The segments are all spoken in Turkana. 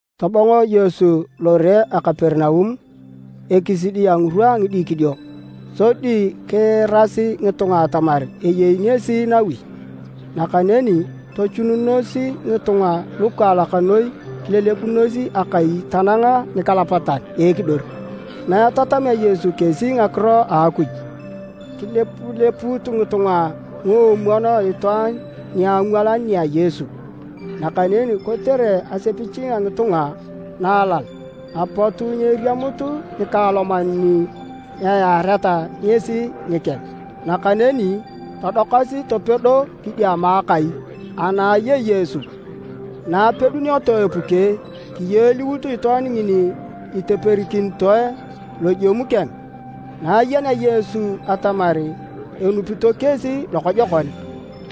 Tobongo Yesu lore a Kaperinaum ekisidi a ngirwa a ngidikidio. Sodi kiirasi ngitunga atamar eyei ngesi nawi. Nakaneni tochununos ngitunga lukaalak noi kilelebunos akai tanang nikalapatan a ekidor. Na etatamea Yesu kesi ngakiro a Akuj, kilepulepuut ngitunga nguomwon itwaan niangwalan nia Yesu. Nakaneni kotere asepich a ngitunga na alal, apot nyeriamut nikaaloman ni eyaareta ngesi nikeng. Nakaneni todokasi topedo kidiama a akai ana ayei Yesu. Na apedunioto epuke, kiyoliut itwaan ngini iteperikinitoe lojemu keng. Na ayenea Yesu atamar enupito kesi lokojokon,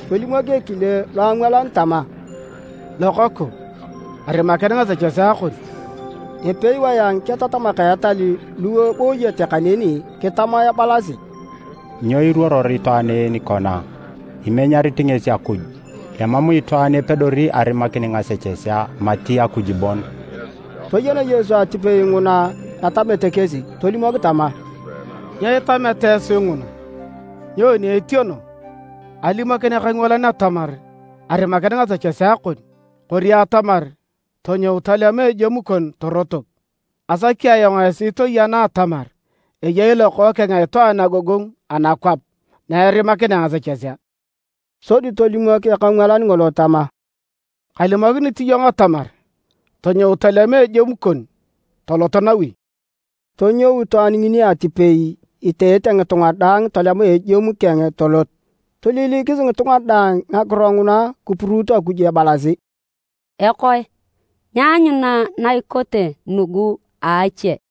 tolimok ekile loangwalan tama, “Lokoku, arimakin ngasechesea kon.” Epewae a ngiketatamak a etal lu ebooyete kaneni kitama ebalasi, “Nyo iruoror itwaan en kona? Imenyarit ngesi Akuj! Emam itwaan epedori arimakin ngasechesea mati Akuj bon!” Toyen Yesu atipei nguna etamete kesi tolimok tama, “Nyo itameta esi nguna? Nyoni etieno, alimokin ekangwalan atamar, ‘Arimakin ngasechesea kon,’ kori atamar, ‘Tonyou, tolema ejemu kon torotok’? Asaki ayong esi toyena atamar eyei Lokookeng a Itwaan agogongu anakwap na erimakinea ngasechesea.” Sodi tolimok ekangwalan ngolo tama, “Kalimokinit iyong atamar tonyou tolema ejemu kon tolot nawi!” Tonyou itwaan ngini atipei iteete ngitunga daang tolema ejemu keng tolot. Toililikis ngitunga daang ngakiro nguna kipuruut Akuj ebalasi, “Ekoe, nyaanyuna na ikote nugu a ache!”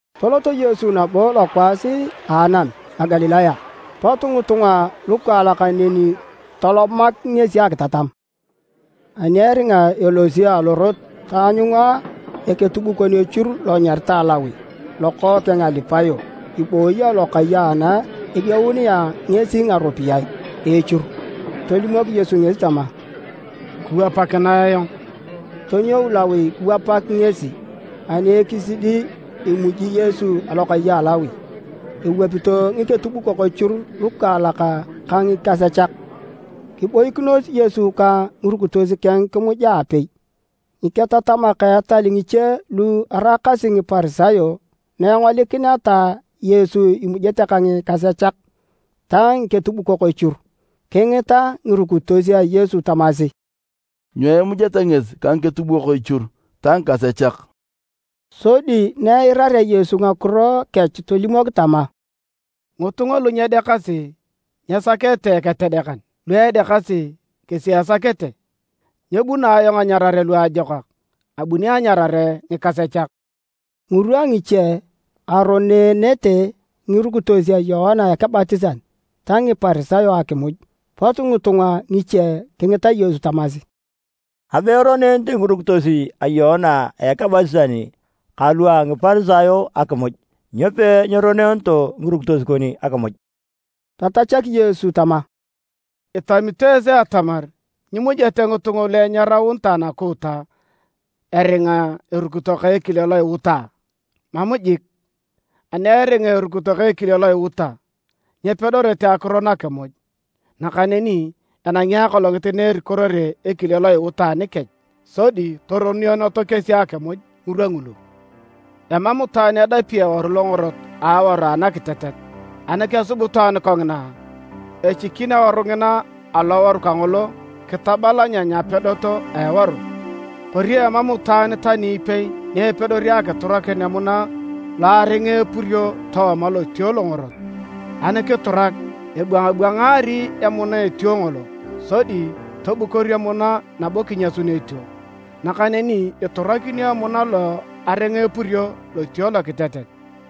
Tolot Yesu nabo lokwaas a anam a Galilaya. Pot ngitunga lukaalak neni tolomak ngesi akitatam. Ani eringa elosi alorot taanyunga eketubukon echur lo anyaritae Lawi lokookeng a Alipayo ibooyi alokai ana edieununea ngesi ngaropiyae a echur. Tolimok Yesu ngesi tama, “Kiwapakinae ayong.” Tonyou Lawi kiwapak ngesi. Ani ekisidi emuji Yesu alokai a Lawi. Ewapito ngiketubukok echur lukaalak ka ngikasechak. Kiboikinos Yesu ka ngirukitos keng kimuja aapei. Ngiketatamak a etal ngiche lu eraakasi Ngiparisayo naengolikineta Yesu imujete ka ngikasechak ta ngiketubukok echur, kingita ngirukitos a Yesu tamasi, “Nyo imujeta ngesi ka ngiketubukok echur ta ngikasechak?” Sodi na eirarea Yesu ngakiro kech tolimok tama, “Ngitunga lu nyedeakasi nyesakete eketedekan, lu edeakasi kesi esakete. Nyebuno ayong anyarare luajokak. Abuni anyarare ngikasechak.” Ngirwa ngiche, aroneenete ngirukitos a Yoana Ekebatisan ta Ngiparisayo akimuj. Pot ngitunga ngiche kingita Yesu tamasi, “Abe eroneenete ngirukitos a Yoana Ekebatisan kalu a Ngiparisayo akimuj, nyo peeroneeneto ngirukitos kon akimuj?” Tatachak Yesu tama, “Itamito esi atamar nyimujete ngitunga lu enyaraunitae nakuuta eringa erukito ka ekile lo iuta a? Mam jik! Ani eringa erukito ka ekile lo iuta, nyepedorete akiron akimuj. Nakaneni enangi akolongit na erikorere ekile lo iuta anikech, sodi toroneeneto kesi akimuj ngirwa ngulu. “Emam itwaan edapi eworu longorot a aworu anakitetet. Ani kesub itwaan kongina, echikin aworu ngina aloworu kangolo kitabalanyany apedot a eworu. Kori emam itwaan tani ipei ni epedori akiturakin emuna lo aringa epurio tooma lotuo longorot, ani kiturak, ebwangabwangaari emuna etuo ngolo sodi tobukor emuna nabo kinyasun etuo. Nakaneni iturakinio emuna lo aringa epurio lotuo lokitetet.”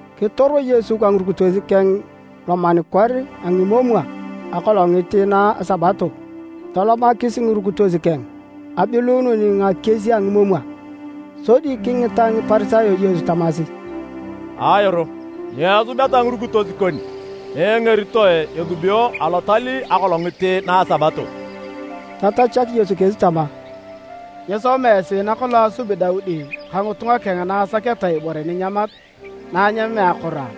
Kitoro Yesu ka ngirukitos keng lomanikor a ngimomwa akolongit na a Sabato. Tolomakis ngirukitos keng abiluunun ngakies a ngimomwa. Sodi kingita Ngiparisayo Yesu tamasi, “Ayoro, nyo esubeta ngirukitos kon na engeritoe esubio alotal akolongit na a Sabato?” Tatachak Yesu kesi tama, “Nyisoma esi nakolong asubi Daudi ka ngitunga keng na asaketa ibore ninyamat na anyamea akoro a?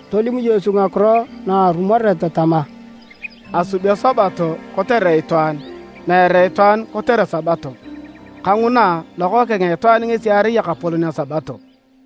Tolim Yesu ngakiro narumoret tama, “Asubio Sabato kotere itwaan meere itwaan kotere Sabato. Kanguna, Lokookeng a Itwaan ngesi erai Ekapolon a Sabato.”